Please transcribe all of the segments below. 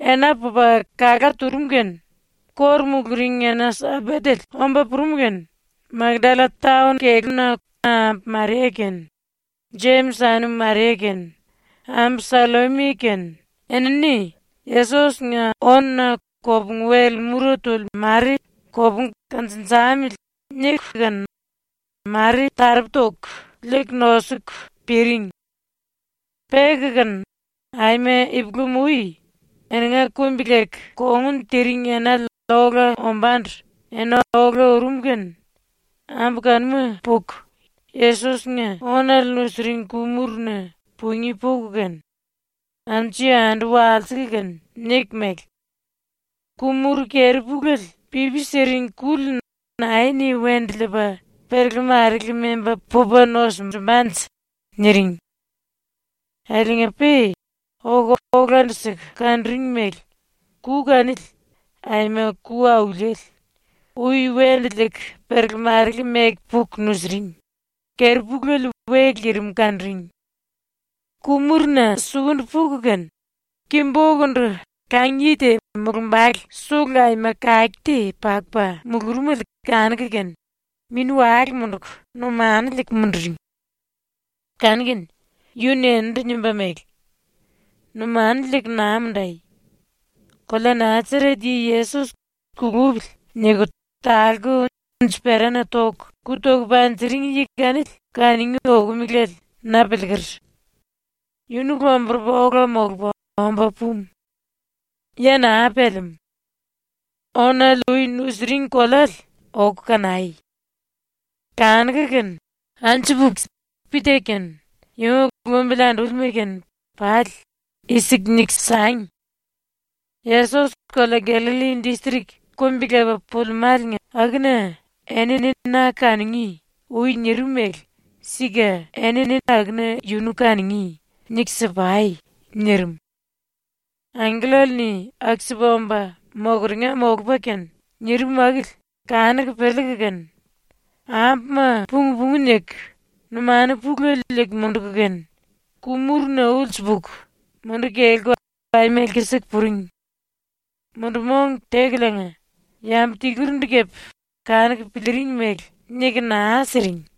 Ena pupa kalá turum kene ⸤kóru muluring⸥ ena-Sambatele omba purum kene Makdalla taon-na ambu Maria kene Jemis anum Maria kene ambu Sallomi kene enini ‘Yesos-nga ónuna kopungu-wel mura tuli mare kopungu kanjinjamili.’ niku kene mare taropu toku liiku ⸤nosuku piring⸥. Peku kene aima ipulam-ui, eninga kumbi-leku kongun tiring enale ola ombándu ena ola urum kene ambu kanuma puku ⸤Yesos-nga⸥ ónale nusiring ku-muruna pungí puku kene, anju-yandu walsiku kene niku mele: “Ku-muru keri-puléle pipi siring kuli nae-ni wendu liipa perele-marele memba pupa nosunjumbanje?” niring. Akiliinga-pe oku olandu-siku kanuring mele ku kanili, aima ku auliele, ui wendu liiku perele-marele meku puku nusiring, ⸤keri-puléle we lirim⸥ kanuring. Ku-muruna sukundu puku kene ki-bokundu kang-yi te mulumbale sulu aima kake te pakupa mulurumele kanuku kene mini-wale munduku numanu liiku munduring. Kanu-kene yu-ni eninindu nimba mele: “Numanu liiku naa mundai. Kolea Nasaret yi Yesos ‘Kulupili.’ niku talku unji-perana ⸤toku⸥ ku toku panjiring yi kanili kanungí okomelale na piliiker. Yunu lomburupa ola molupa omba pumu. Ya naa pelemú. Ónale ui nusiring koleale oku kanai. Kanuku kene anju puku Pita kene yunga lumbili andúlima kene pali i-siku niku sangi: “Yesos kolea Gallalli distrik kumbi-lepa pulimáliinga akuna “Eni na kanungí.” ui nirim mele sika eni akuna yunu kanungí.” niku si-pai.” nirim. ⸤Angkellale-ni aku-sipa omba mokeringa molupa kene nirim akili⸥ kanuku piliiku kene ambuma pung-pungu niku numanu pulele liiku munduku kene ku-muruna ulsu puku munduku kelku aima lkisiku puring. Mundu-mong tekuliinga yambu tilurindu kepe kanuku piliiring mele niku naa siring.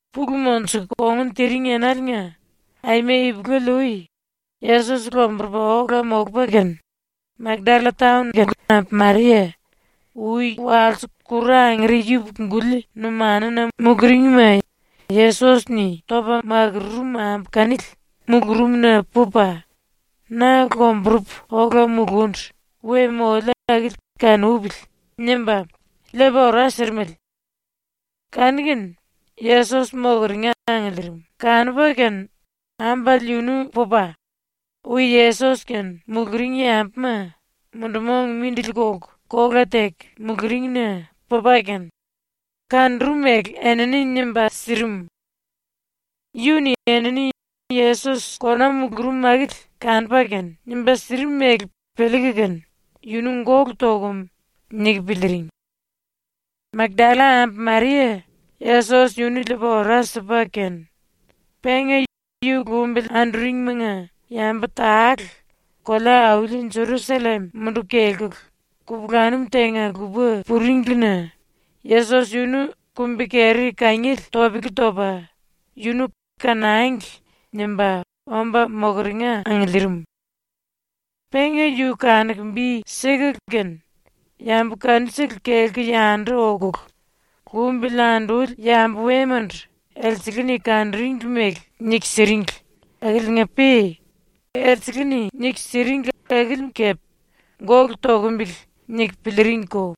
Pulu monjuku kongun tiring enaliinga, aima ipulele-ui, Yesos lomburupa ola molupa kene, Makdalla taon ambu Maria, ui walse kuru angere yupuku-guli numanuna muluringma Yesos-ni topa makururum ambu kanili mulurumna pupa ⸤‘Na lomburupu ola mulundu we moliu akili kanupili.’ nimba⸥ liipa ora sirimele. Kanu-kene Yesos ⸤mokeringa angiliirim⸥ kanupa kene ambale yunu pupa, ui Yesos-kene muluring yambuma mundu-mong mindili kolku kola teku muluringna pupa kene kanurum mele enini nimba sirim. Yu-ni enini Yesos kona mulurum akili kanupa kene nimba sirim mele piliiku kene ‘Yunu gólu tokum.’ niku piliiring. ⸤Makdalla ambu Maria Yesos yunu liipa ora sipa kene,⸥ penga ⸤yu lumbili anduringimanga⸥ yambu tale ⸤kolea-auli Jerusallem munduku kelkulu⸥ kupulanum tenga-lupa puringlina Yesos yunu kumbi-keri kangiele topele topa yunu ‘kanangli.’ nimba omba mokeringa angiliirim. Penga yu kanuku bi sikulu kene yambu kanusele kelku yandu okulu ⸤lumbili anduli⸥ yambu wemandu elsele-ni kanuringli mele niku siringli akiliinga-pe elsele-ni niku siringli akili kepe ‘Gólu tokombele.’ niku piliiringko.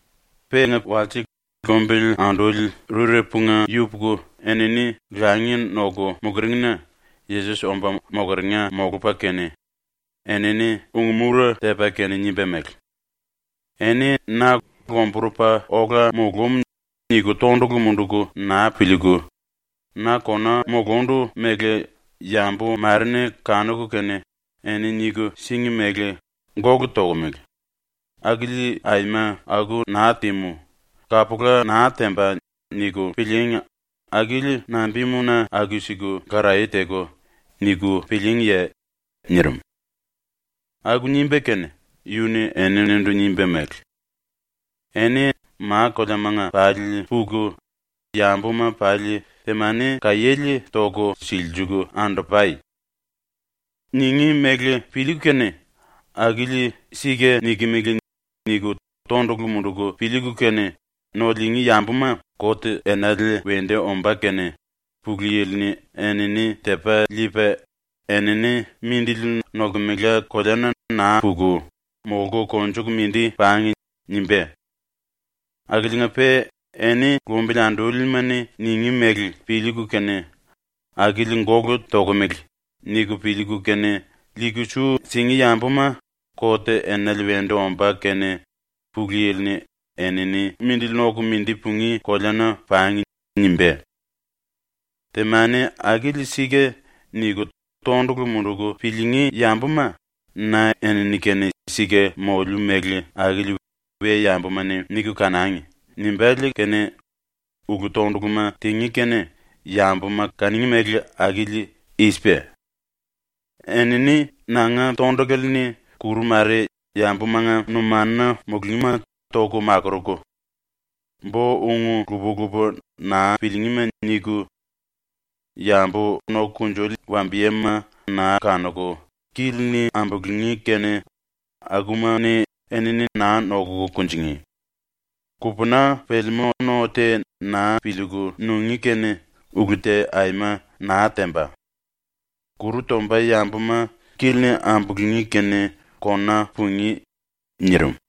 Penga walse lumbili anduli rurepunga yupuku enini langi noku muluringna Yesos omba mokeringa molupa kene, enini ung-mura tepa kene nimba mele: “Eni na ‘Lomburupa ola mulúm.’ niku tondulu munduku naa piliiku, na kona mulundu mele yambu mare-ni kanuku kene eni niku síngi mele ‘Gólu tokomele. Akili aima aku naa tímu, kapula naa temba.’ niku pilííngi, akili nambimuna aku-siku karaye teku niku pilííngiye?” nirim. ⸤Aku nimba kene⸥ yu-ni eninindu nimba mele: “Eni ma-koleamanga pali puku yambuma pali temani kaiéle toku silsiliiku andu-pai. Ningí mele piliiku kene ‘Akili sika nikimili.’ niku tondulu munduku piliiku kene no liingí yambuma ⸤kot enale wendu ombá kene⸥ Pulu Yili-ni enini tepa liipa ‘Enini mindili nolkemela koleana naa puku, molku konjuku mindi pangi.’ nimbá. Akiliinga-pe ⸤eni lumbili andúlima-ni⸥ ningí mele piliiku kene ‘Akili gólu tokomele.’ niku piliiku kene liiku su singí yambuma ⸤kot enale wendu ombá kene⸥ Pulu Yili-ni ‘Enini mindili noku mindi pungí koleana pangi.’ nimbá. “‘Temani akili sika.’ niku tondulu munduku piliingí yambuma ‘Na enini-kene sika moliu mele akili we-yambuma-ni niku kanangi.’ nimbále kene ulu-tonduluma tingí kene yambuma kanungí mele akili i-sipa: Enini nanga tondulale-ni kuru mare yambumanga numanuna mulungíma toku makuruku; bo-ung lupa-lupa naa piliingíma niku; yambu noku kunjuli wambiyema naa kanuku kili-ni ambulungí kene akuma-ni enini naa noku kunjingí; kupuná pelemú no te naa piliiku nungí kene ulu te aima naa temba; kuru tomba yambuma kili-ni ambulungí kene kona pungí.” nirim.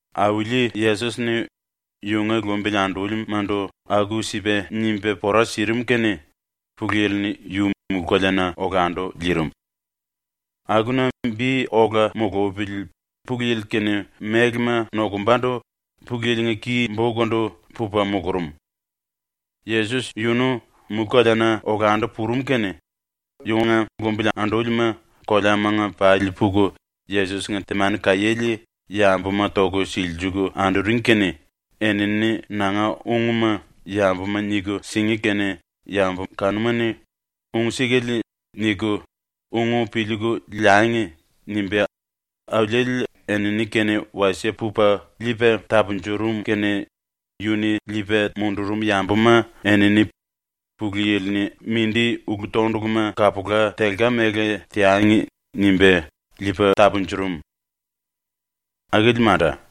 Auli Yesos-ni ⸤yunga lumbili andúlima⸥ndu aku-sipa nimba pora sirim kene ⸤Pulu Yili-ni⸥ yu mulú-koleana olandu liirim. Akuna ⸤bi ola mulupili Pulu Yili-kene mélema nokumbandu⸥ Pulu Yili-nga ki-bokundu pupa mulurum. Yesos yunu mulú-koleana olandu purum kene yunga lumbili andúlima koleamanga pali puku Yesos-nga temani kaiéle yambuma toku silsiliiku anduring kene ‘Enini nanga ungma yambuma niku singí kene yambu kanuma-ni ‘Ung sikale.’ niku ung piliiku liangi.’ nimba Auliele enini-kene wasie pupa liipa tapunjurum kene yu-ni liipa mundurum yambuma enini ‘Pulu Yili-ni mindi ulu-tonduluma kapula telka mele teangi.’ nimba liipa tapunjurum. ⸤Akili manda.⸥